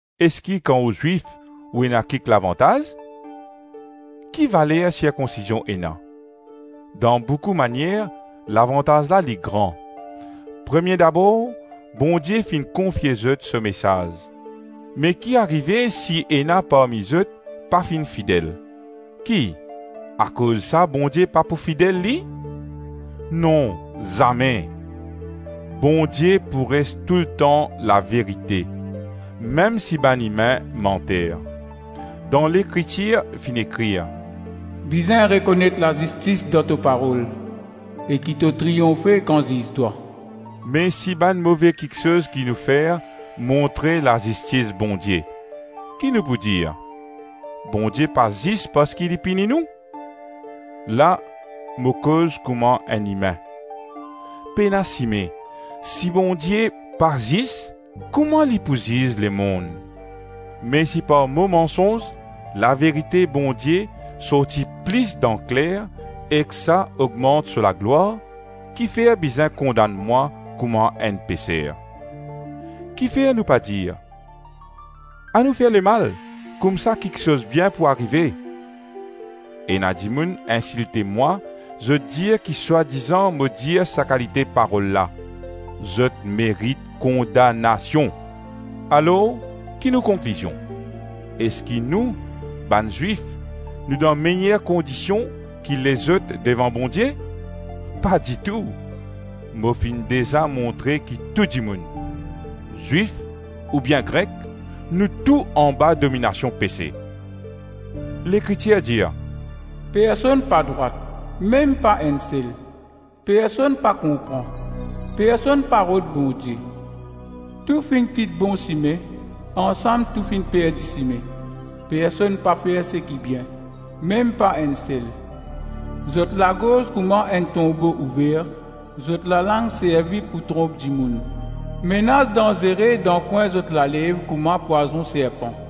Eski kan ou Zwif ou ena kik lavantaz? Ki valer sirkonsizion ena? Dan boukou manier lavantaz la li gran. Premie dabor Bondie finn konfie zot so mesaz. Me ki arive si ena parmi zot pa finn fidel? Ki, akoz sa Bondie pa pou fidel li? Non, zame! Bondie pou res toultan laverite, mem si bann imin manter. Dan Lekritir finn ekrir, “Bizin rekonet lazistis dan to parol, e ki to triyonfe kan ziz twa.” Me si bann move kiksoz ki nou fer montre lazistis Bondie, ki nou pou dir? Bondie pa zis parski li pini nou? La mo koz kouma enn imin. Pena sime! Si Bondie pa zis, kouma li pou ziz lemonn? Me si par mo mansonz, laverite Bondie sorti plis dan kler ek sa ogmant so laglwar, kifer bizin kondann mwa kouma enn peser? Kifer nou pa dir, “Anou fer lemal, koumsa kiksoz bien pou arive”? Ena dimoun insilte mwa, zot dir ki swadizan mo dir sa kalite parol la. Zot merit kondanasion. Alors ki nou konklizion? Eski nou, bann Zwif, nou dan meyer kondision ki lezot devan Bondie? Pa ditou! Mo finn deza montre ki tou dimoun, Zwif oubien Grek, nou tou anba dominasion pese. Lekritir dir, “Personn pa drwat, mem pa enn sel; personn pa konpran, personn pa rod Bondie; Tou finn kit bon sime; ansam tou finn perdi sime; personn pa fer seki bien, mem pa enn sel. Zot lagorz kouma enn tonbo ouver; zot lalang servi pou tronp dimoun; menas danzere dan kwin zot lalev kouma pwazon serpan;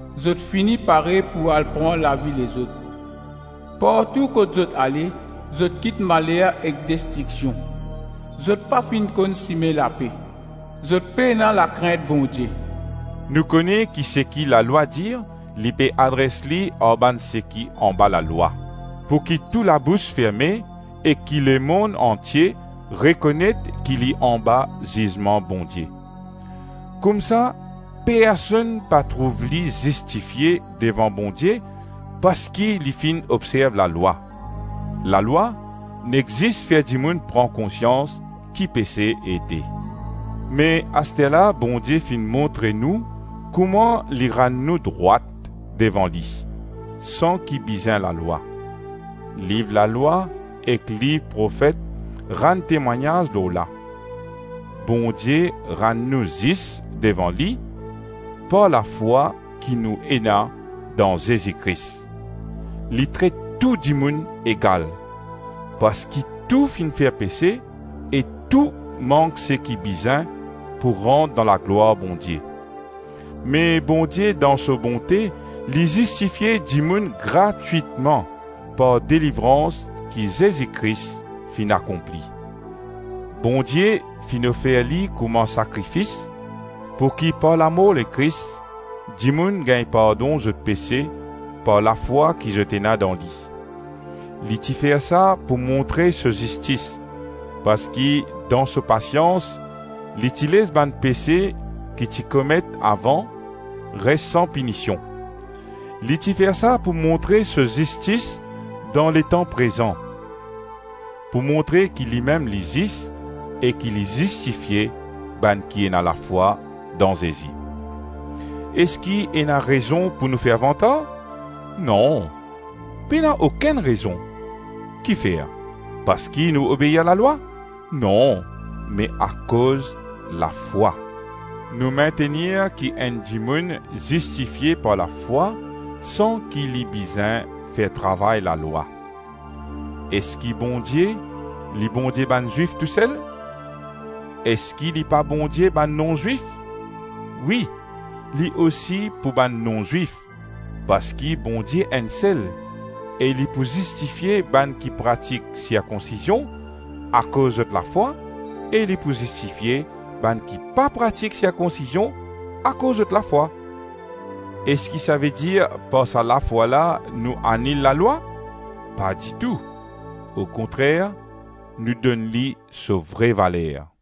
zot fini pare pou al pran lavi lezot; partou kot zot ale, zot kit maler ek destriksion; zot pa finn konn sime lape. Zot pena lakrint Bondie.” Nou kone ki seki lalwa dir, li pe adres li ar bann seki anba lalwa, pouki tou labous ferme ek ki lemonn antie rekonet ki li anba zizman Bondie. Koumsa personn pa trouv li zistifie devan Bondie parski li finn obzerv lalwa. Lalwa nek zis fer dimoun pran konsians ki pese ete. Me asterla Bondie finn montre nou kouma li rann nou drwat devan li, san ki bizin lalwa. Liv Lalwa ek liv profet rann temwagnaz lor la. Bondie rann nou zis devan li par lafwa ki nou ena dan Zezi Kris. Li tret tou dimoun egal, parski tou finn fer pese e tou mank seki bizin pou rant dan laglwar Bondie. Me Bondie dan so bonte li zistifie dimoun gratwitman par delivrans ki Zezi Kris finn akonpli. Bondie finn ofer li kouma sakrifis pouki par lamor Lekris dimoun gagn pardon zot pese par lafwa ki zot ena dan li. Li ti fer sa pou montre so zistis, parski dan so pasians li ti les bann pese ki ti komet avan res san pinision; li ti fer sa pou montre so zistis dan letan prezan, pou montre ki limem li zis e ki li zistifie bann ki ena lafwa dan Zezi. Eski ena rezon pou nou fer vantar? Non, pena okenn rezon! Kifer? Parski nou obeir lalwa? Non, me akoz lafwa. Nou mintenir ki enn dimoun zistifie par lafwa san ki li bizin fer travay lalwa. Eski Bondie, li Bondie bann Zwif tousel? Eski li pa Bondie bann non-Zwif? Wi, li osi pou bann non-Zwif parski Bondie enn sel, e li pou zistifie bann ki pratik sirkonsizion akoz zot lafwa, e li pou zistifie bann ki pa pratik sirkonsizion akoz zot lafwa. Eski savedir par sa lafwa la nou anil lalwa? Pa ditou! Okontrer nou donn li so vre valer.